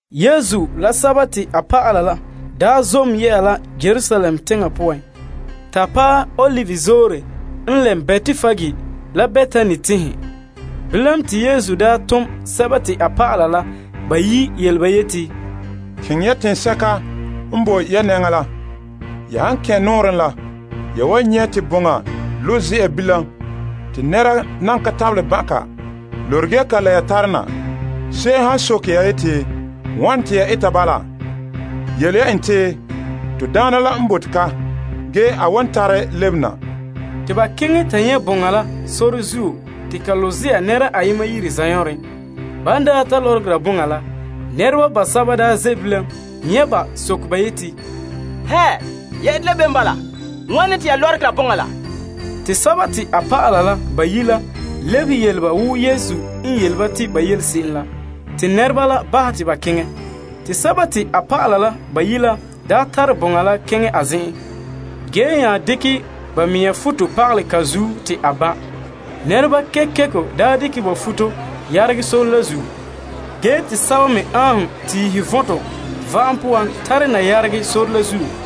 Yesu la a dɔlɔba la n daa zom la Yerusalem teŋa poan ta paɛ Olive Zoore n lɛm Betpage la Betani teŋhe, Yesu daa tom a dɔlɔba la bayi' yele ba yeti, Keŋɛ ya teŋsɛka n boe ya nɛŋan ha la. Ya han kɛn' nɔɔrɛn la, ya wan nyɛ' te boŋa lo' ze'a bilam te nɛra nan ka tabelɛ ban' ka. Lorege ya ka la ya tare na. Se'em han soke ya, wane te ya eta bala, yele ya en, to Daana la n bote ka ge a wan tare lebe na. Te ba keŋɛ ta nyɛ' boŋa la sore zuo te ka lo' yire ayema zanɔɔren. Ban daa ta lɔrɔgera boŋa la, nɛreba basɛba daa ze' bilam nyɛ' ba soke ba yeti, Ya ete la bem wa? Wane te ya lɔrɔgera boŋa la? Te ba lebehe yele ba wo Yesu n yele ba te ba yele se'em la, te nɛreba la bahɛ ba te ba keŋɛ. Te ban tare boŋa la keŋɛ a zen'en, ba nya dekɛ ba mea futo pagalɛ ka zuo te a ban'. Nɛreba kekeko dekɛ ba futo yeregɛ sore la zuo, ge te sɛba me aanhom tiihe vɔntɔ va'am poan tare na yeregɛ sore la zuo.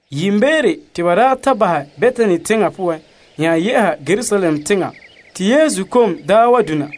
Yiimbeere, te ban daa ta bahɛ Betani teŋa yɛ'a Yerusalem, Yesu kom daa wa dona.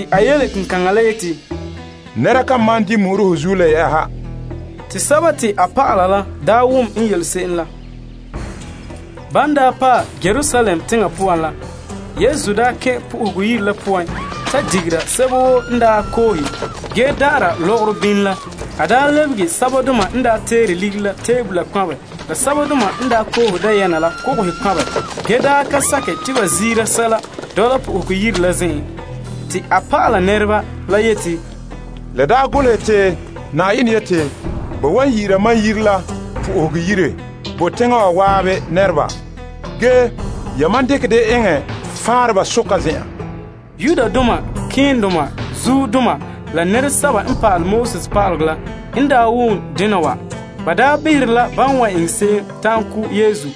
A yele kenkaŋa la yeti, Nɛra kan malom di' mu'uro ho zuo le yɛ'ɛha. Te a dɔlɔba la wom n yele se'em la. Ban daa paɛ Yerusalem teŋa poan la, Yesu kɛn' Yenɛ Yire la zen'en ta pɔhɛ digera sɛba woo n daa koohe ge da'ara lɔgɔrɔ bini la. A lebege sɛbadoma n daa teere ligiri la tebola kpanbɛ la sɛbadoma n daa koohe dayɛna la kogohe kpanbɛ ge da sakɛ te ba ziira sɛla dɔla Yenɛ Yire zenzagahe la poan. Te en pa'ala ba la a yeti, La golehɛ te, Mam Yire la yu'urɛ wan yi'ira la po'ohegɔ yire bo teŋa woo. Ge, yamam dekɛ dɛ eŋɛ faanreba zen'an. Malema keendoma la pa'alegɔ pa'aleba la n ta wom dena wa, ba pɔhɛ behera la ba wan eŋɛ se'em ta'an ko' Yesu.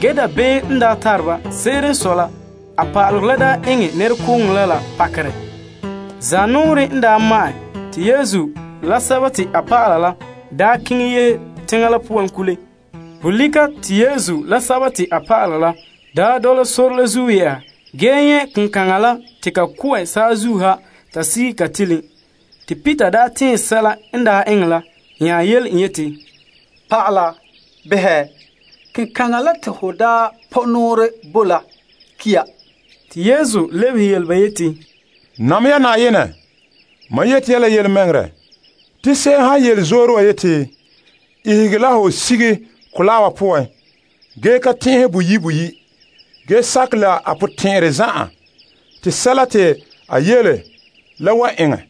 Se'ere n sɔe dabeem n tare ba, a pa'alegɔ la daa eŋɛ nɛrekooŋɔ la pakerɛ la zuo. Zanɔɔrɛ n daa ma'ɛn, Yesu la a dɔlɔba la yehe teŋa la poan kule. Bolika Yesu la a dɔlɔba la n daa dɔla sore la zuo yɛ'a, ba nyɛ' kenkaŋa la te ka ko'ɛ saazuo ha ta sige ka tiilin. Peter tɛɛn nya yele Yesu yeti, Naa, behɛ. Kenkaŋa la te ho daa pɔ' nɔɔrɛ bo la ki' ya. Yesu lebehe en yeti, Nam ya Na'ayenɛ. Mam yeti ya la yelemɛŋɛrɛ, te se'em han yele zoore wa yeti, Ihege la ho sige mɔgɔrɛ wa poan, ge ka tɛn'ɛha boyi' boyi' ge sakɛ la a potɛn'ɛrɛ zan'an, la wan eŋɛ.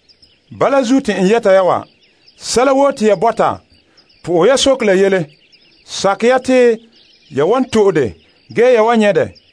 Bala zuo te n yɛta ya, sɛla woo te ya sohɛ Yenɛ, sakɛ ya te ya wan to'e dɛ, ge ya wan nyɛ' dɛ.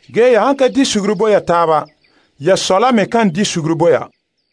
Ge ya han ka di suguru bo ya taaba, ya Sɔ la me kan bahɛ ya be'em bo ya.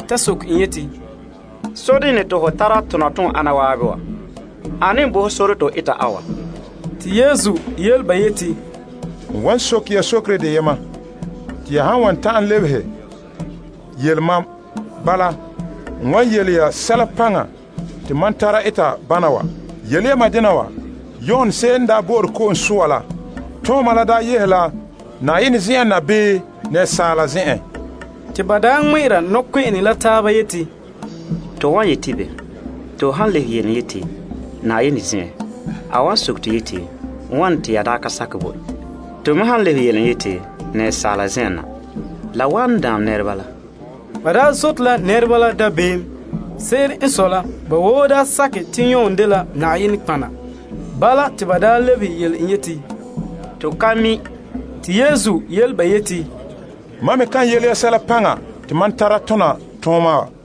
Ba soke en yeti, Sodena te ho tara tona toon ana zan'an wa? Ane n bo ho sore te ho eta a wa? Yesu lebehe ba yeti, N wan soke ya sokere deyema te ya han wan ta'an lebehe, yele mam, ge n wan yele ya sɛla paŋa te mam tara eta bana wa. Yele ya mam dena wa. Yon ko'sɔɔra la daa yehe la Yenɛ zen'en na bii asaala zen'en? Te ba daa tɔgɔra la taaba yeti, To wan yeti bo? To han lebehe en yeti, Yenɛ zen'en, a wan soke to yeti, Wane te ya daa ka sakɛ bo en? To me han lebehe en yeti, Asaala zen'en, la wan daam nɛreba la. Ge ba daa zote la nɛreba la dabeem. Se'ere n sɔe la la ba woo daa sakɛ te Yon dela nɔtɔgɔha. Bala, te ba lebehe yele en yeti, To ka mi'. Te Yesu yele ba yeti, Mam me kan yele ya sɛla paŋa te mam tara tona tooma wa.